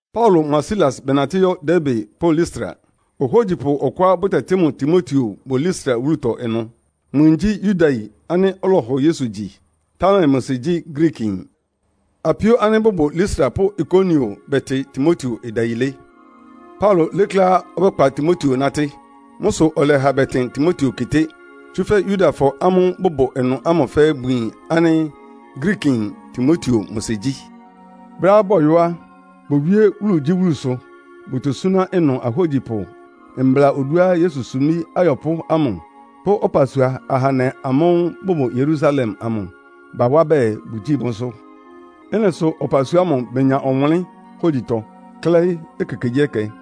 Paulo mʋa Silas bɛnatɩ́ yɔ́ Derbe pʋ́ Listra. Ohógyipʋ ɔkʋá bʋtɛtɩ́ mʋ Timoteo bʋ Listra wúlutɔ ɩnʋ. Mʋ yin gyí Yudayin ánɩ́ ɔlɔhɔ Yesu gyi, támɛ mʋ sɩ gyí Griikiyin. Apíó ánɩ́ bʋbʋ Listra pʋ́ Ikonion bɛtɩ Timoteo ɩdayilé. Paulo lékléá ɔbɛ́kpa Timoteo nátɩ́. Mʋ́ sʋ ɔlɛha bɛtɩn Timoteo keté, tsúfɛ́ Yudafɔ ámʋ́ʋ́ bʋbʋ ɩnʋ ámʋ fɛ́ɛ́ bʋyin ánɩ́ Griikiyin Timoteo mʋ sɩ gyí. Brɛ́á bɔyɔ́ á, bowíé wúlugyíwúlusʋ bʋtosúná ɩnʋ ahógyipʋ mbla oduá Yesu sumbí ayɔpʋ́ ámʋ pʋ́ ɔpasua ahandɛ amʋ́ʋ́ bʋbʋ Yerusalem amʋ bawá bɛɛ bʋgyíi mʋ́sʋ́. Ɩ́nɩ sʋ ɔpasua ámʋ benya ɔwʋnlɩ́n hógyitɔ, klɛ́ɩ́ ekekegyíɛkɛ.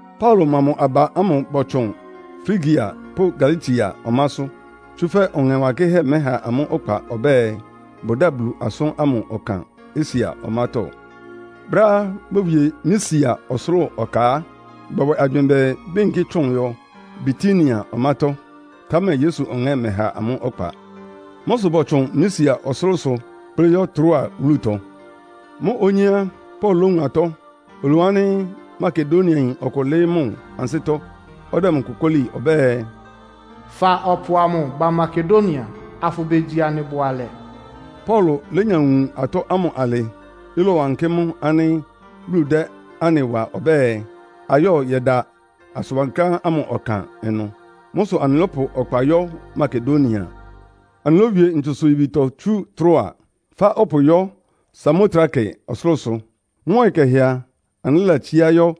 Paulo mʋa mʋ aba ámʋ bɔtsʋn Frigia pʋ́ Galatia ɔmásʋ́. Tsúfɛ́ Ɔŋɛ Wankɩ́hɛ́ mɛ́ha amʋ́ ɔkpa ɔbɛ́ɛ, bʋdáa Bulu asʋ́n ámʋ ɔkan Asia ɔmátɔ́. Brɛ́á bowie Misia ɔsʋlʋ́ʋ ɔka á, bɔbwɛ agywɩɩn bɛɛ béyinkí tsʋn yɔ Bitinia ɔmátɔ́, támɛ Yesu Ɔŋɛ́ mɛha amʋ́ ɔkpa. Mʋ́ sʋ bɔtsʋn Misia ɔsʋlʋ́sʋ kplɩ́ yɔ́ Troa wúlutɔ. Mʋ́ onyé á, Paulo lówun atɔ́. Olowun ánɩ́ Makedoniayin ɔkʋ lɩ́ɩ́ mʋ ansɩ́tɔ́, ɔdɛ mʋ kokóli ɔbɛ́ɛ, “Fa ɔpʋ amʋ ba Makedonia, afʋbegyi anɩ bʋalɛ.” Paulo lénya wun atɔ́ ámʋ alɩ, ɩlɔwankɩ́ mʋ ánɩ́ Bulu dɛ́ anɩ wa ɔbɛ́ɛ, ayɔ́ yɛda asʋn wankláán ámʋ ɔkan ɩnʋ. Mʋ́ sʋ anɩlɔ́pʋ ɔkpa yɔ́ Makedonia. Anɩlówie ntsusʋ-yibitɔ tsú Troa, fá ɔpʋ yɔ́ Samotrake ɔsʋlʋ́sʋ. Mʋ́ ɔyɩ kɛhɛ a, anɩlɛ́latsíá yɔ́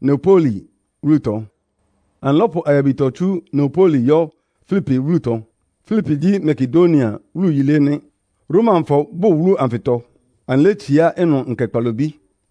Neapoli wúlutɔ. Anɩlɔ́pʋ ayabitɔ tsú Neapoli yɔ́ Filipi wúlutɔ. Filipi gyí Makedonia wúlu yilé nɩ́. Romafɔ bʋ́ʋ wúlu anfɩtɔ. Anɩlétsiá ɩnʋ nkɛ kpalobí.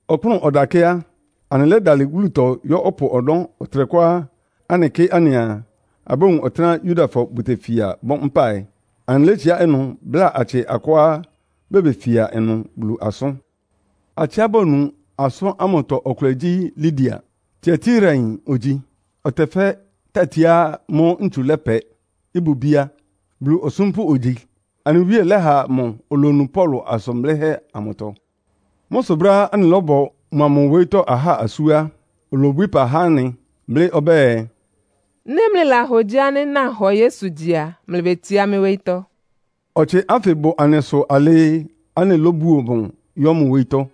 Ɔkpʋ́nʋ́ ɔdakɛ́ á, anɩlɛ́dalɩ wúlutɔ yɔ́ ɔpʋ ɔnɔ́ ɔtɩnɛkʋá anɩkɩ́ anɩaa, abówun ɔtɩ́nɛ́á Yudafɔ bʋtefia bɔ mpáɩ. Anɩlétsiá ɩnʋ bláa atsɩ akʋá bebefia ɩnʋ Bulu asʋ́n. Atsɩá bonu asʋ́n ámʋtɔ ɔkʋlɛ gyí Lidia. Tiatirayin ogyi, ɔtɛfɛ́ tatiá mʋ́ ntsu lɛpɛ, ɩbʋ bíá. Bulu osúmpʋ́ ogyi. Anɩ Wíe lɛ́ha mʋ olonu Paulo asʋn blɩ́hɛ́ amʋtɔ. Mʋ́ sʋ brɛ́á anɩlɔ́bɔ mʋa mʋ wóyítɔ́ ahá asú á, olobwií ɩpa há anɩ, blɩ́ ɔbɛ́ɛ, “Nɩ́ mlɩlahogyi ánɩ́ nahɔ Yesu gyi a, mlɩbetsiá mɩ́ wóyítɔ́.” Ɔtsɩ ánfɩ bʋ anɩsʋ alɩɩ anɩlóbuo mʋ yɔ́ mʋ wóyítɔ́.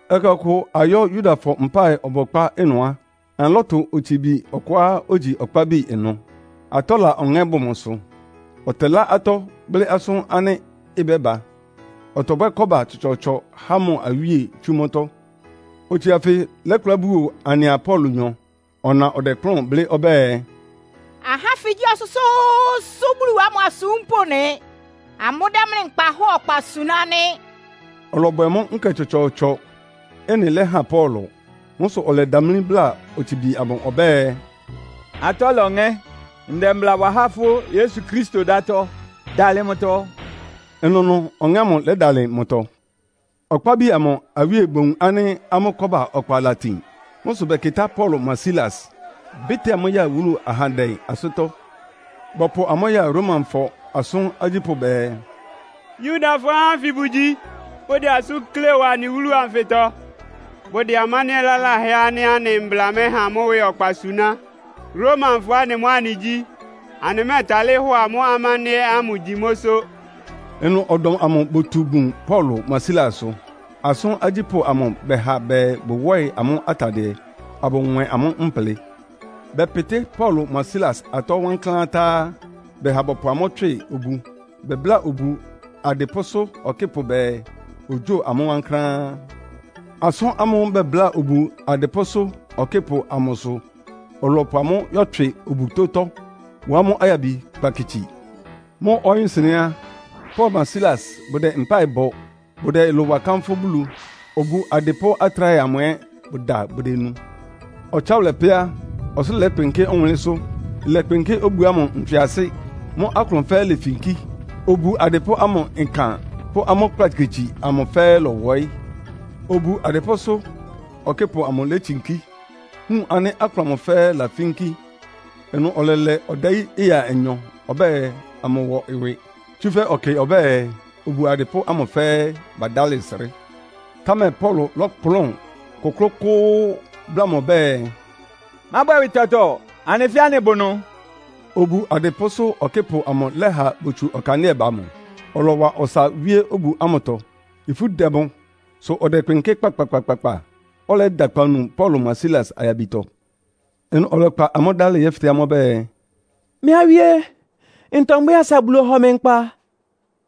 Ɛkɛ ɔkʋ ayɔ́ Yudafɔ mpáɩ ɔbɔkpá ɩnʋ á, anɩlɔ́tʋ otsibi ɔkʋá ogyi ɔkpábi ɩnʋ. Atɔ́la ɔŋɛ́ bʋ mʋsʋ, ɔtɛlá atɔ́, blɩ́ asʋ́n ánɩ́ ɩbɛ́ba. Ɔtɔbwɛ́ kɔ́ba tsɔtsɔɔtsɔ há mʋ awíe tsú mʋ́tɔ́. Otsibi anfɩ lɛ́kplá buo anɩa Paulonyɔ. Ɔna ɔdɛkplʋ́n blɩ́ ɔbɛ́ɛ, “Ahá ánfɩ gyí Ɔsʋ́sʋ́ʋ́sʋ́ Bulu ámʋ asúmpʋ́ nɩ. Amʋ́dɛ́ mlɩ nkpahɔ́ɔ ɔkpa suná nɩ́.” Ɔlɔbwɛ mʋ́ nkɛ tsɔtsɔɔtsɔ. Ɩ́nɩ lɛhan Paulo. Mʋ́ sʋ ɔlɛdamlí bláa otsibi amʋ ɔbɛ́ɛ, “Atɔ́la ɔŋɛ́, ndɛ mbla wa há fʋ́ Yesu Kristo dátɔ́, dalɩ mʋtɔ!” Ɩnʋnʋ ɔŋɛ́ ámʋ lɛ́dalɩ mʋtɔ. Ɔkpábi amʋ awíe bowun ánɩ́ amʋ́ kɔ́ba ɔkpa latin. Mʋ́ sʋ bɛkɩtá Paulo mʋa Silas, bɩ́tɩ́a amʋ́ ya wúlu ahandɛ ansɩ́tɔ́. Bɔpʋ amʋ́ ya Romafɔ asʋ́n agyípʋ́ bɛɛ, “Yudafɔ ahá ánfɩ bʋgyi, bʋdɛ asʋ́n klée wa anɩ wúlu anfɩtɔ. Bʋdɛ amándɩ́ɛ́ laláhɛ ánɩ́ anɩ mbla mɛha mʋ́ ɩwɩ ɔkpa suná. Romafɔ anɩ mʋ́ anɩgyí. Anɩmɛ́ɛtalɩ́ hɔ amʋ́ amándɩ́ɛ́ ámʋ gyi mʋ́sʋ́.” Ɩnʋ ɔdɔm amʋ botu bun Paulo mʋa Silasʋ. Asʋ́n agyípʋ́ amʋ bɛha bɛɛ bʋwɔ́ɩ amʋ́ atadɩɛ, abʋnwɛn amʋ́ mplɩ. Bɛpɩtɩ́ Paulo mʋa Silas atɔ́ wankláán tá á, bɛha bɔpʋ amʋ́ tswɩ obu. Bɛbláa obu adɩpʋ́sʋ́ ɔkɩ́pʋ bɛɛ, ogyóo amʋ́ wankláán. Asʋ́n ámʋ́ʋ́ bɛbláa obu adɩpʋ́sʋ́ ɔkɩ́pʋ amʋ sʋ ɔlɔpʋ amʋ́ yɛ́tswɩ obutótɔ́, wá amʋ́ ayabi kplakitsi. Mʋ́ ɔyɩ́-nsɩnɛ́ á, Paulo mʋa Silas bʋdɛ mpáɩ bɔ, bʋdɛ ɩlʋ wa kánfʋ́ Bulu. Obu adɩpʋ́ atráhɛ amʋ ɛ́ bʋda bʋdenu. Ɔtsáwʋlɛ pɛ́ á, ɔsʋlʋ́ʋ lɛ́kpɩnkɩ́ ɔwʋnlɩ́nsʋ́, ɩlɛkpɩnkɩ́ obu ámʋ ntswɩasɩ. Mʋ́ aklʋn fɛ́ɛ́ lefinkí. Obu adɩpʋ́ ámʋ ɩkan pʋ́ amʋ́ kplakitsi amʋ fɛ́ɛ́ lɔwɔɩ́. Obu adɩpʋ́sʋ́ ɔkɩ́pʋ amʋ létsinkí, wun ánɩ́ aklʋn amʋ fɛ́ɛ́ lafínkí. Ɩnʋ ɔlɛlɛ ɔdayí ɩya anyɔ ɔbɛ́ɛ amʋwɔ ɩwɩ, tsúfɛ́ ɔkɩ ɔbɛ́ɛ obu adɩpʋ́ ámʋ fɛ́ɛ́ badálɩ srɩ́. Támɛ Paulo lɔ́kplʋn kʋ́klʋ́kʋ́ʋ́ bláa mʋ ɔbɛ́ɛ, “Mábwɛ ɩwɩ tɔtɔ. Anɩ fɛ́ɛ́ anɩbʋ ɩnʋ.” Obu adɩpʋ́sʋ́ ɔkɩ́pʋ amʋ lɛ́ha botsu ɔkandɩ́ɛ ba mʋ, ɔlɔwa ɔsa wíé obu ámʋtɔ. Ifú dɛ mʋ, sʋ ɔdɛkpɩnkɩ́ kpakpakpakpa. Ɔlɛyɛ́da akpawunu Paulo mʋa Silas ayabitɔ. Ɩnʋ ɔlɛkpa amʋ́ dálɩ yɛ́fɩtɛ́ amʋ́ ɔbɛ́ɛ, “Mɩ́ awíé, ntɔ mbwɛ́ɛ asa Bulu ɔhɔ mɩ nkpa?”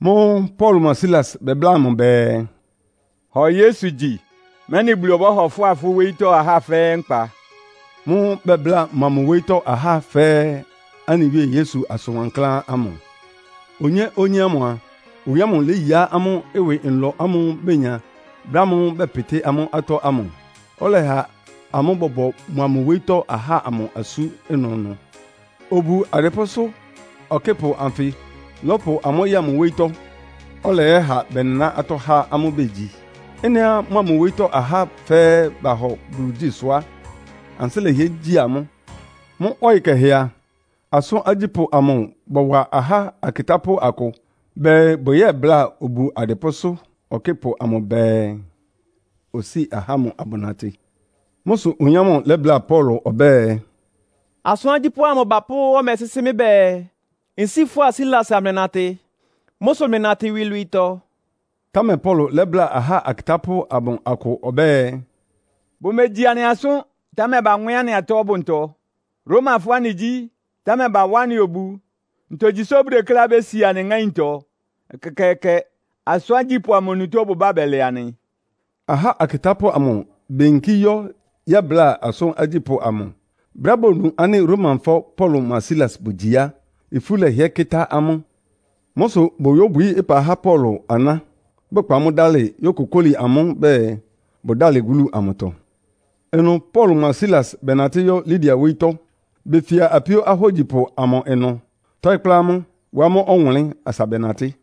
Mʋ́ʋ́ Paulo mʋa Silas bɛbláa mʋ bɛɛ, “Hɔ Yesu gyi, mɛ́nɩ Bulu ɔbɔ́hɔ fʋ́a fʋ́ wóyítɔ́ ahá fɛ́ɛ́ nkpa.” Mʋ́ʋ́ bɛbláa mʋa mʋ wóyítɔ́ ahá fɛ́ɛ́ anɩ Wíe Yesu asʋn wankláán ámʋ. Onyé-onyé ámʋ a, oyin ámʋ léyiá amʋ́ ɩwɩ nlɔ ámʋ́ʋ́ benya brɛ́ ámʋ́ʋ́ bɛpɩtɩ́ amʋ́ atɔ́ ámʋ. Ɔlɛha amʋ́ bɔbɔ mʋa mʋ wóyítɔ́ ahá ámʋ asú ɩnʋnʋ. Obu adɩpʋ́sʋ́ ɔkɩ́pʋ anfɩ lɔ́pʋ amʋ́ ya mʋ wóyítɔ́, ɔlɛyɛ́ha bɛnɩná atɔ́ há amʋ́ begyi. Ɩ́nɩá mʋa mʋ wóyítɔ́ ahá fɛ́ɛ́ bahɔ Bulu gyi sʋ á, ansɩ́ lɛhɩɛ gyi amʋ́. Mʋ́ ɔyɩ kɛhɛ a, asʋ́n agyípʋ́ amʋ bɔwa ahá akɩtápʋ́ akʋ bɛɛ bʋyɛ́bláa obu adɩpʋ́sʋ́ ɔkɩ́pʋ amʋ bɛɛ, osíi ahá ámʋ abʋnatɩ. Mʋ́ sʋ oyin ámʋ lɛ́bláa Paulo ɔbɛ́ɛ, “Asʋ́n agyípʋ́ amʋ bapʋ́ ɔmɛ sɩ́sɩ́ mɩ́ bɛɛ, nsíi fʋ́a Silas amlɩnatɩ. Mʋ́ sʋ mlɩnatɩ iwilwiitɔ.” Támɛ Paulo lɛ́bláa ahá akɩtápʋ́ amʋ akʋ ɔbɛ́ɛ, “Bʋmegyi anɩ asʋ́n, támɛ banwɛ́n anɩ atɔ́ ɔbʋntɔ. Romafɔ anɩgyí, támɛ bawá anɩ obu. Ntogyi sʋ bʋdekléá bési anɩ ŋáintɔ? Ɛkɛkɛɛkɛ! Asʋ́n agyípʋ́ amʋ onutó bʋbá bɛlɛ anɩ.” Ahá akɩtápʋ́ amʋ beyinkí yɔ́ yɛ́bláa asʋ́n agyípʋ́ amʋ. Brɛ́á bonu ánɩ́ Romafɔ Paulo mʋa Silas bʋgyi á, ifú lɛhɩɛ́ kɩ́tá amʋ́. Mʋ́ sʋ boyóbwií ɩpa há Paulo aná, bɛkpa amʋ́ dalɩ yókokóli amʋ́ bɛɛ bʋdálɩ wúlu amʋtɔ. Ɩnʋ Paulo mʋa Silas bɛnatɩ́ yɔ́ Lidia wóyítɔ́. Befia apíó ahógyipʋ amʋ ɩnʋ, tɔɩ́ kplá amʋ́, wá amʋ́ ɔwʋnlɩ́n asa bɛnatɩ́.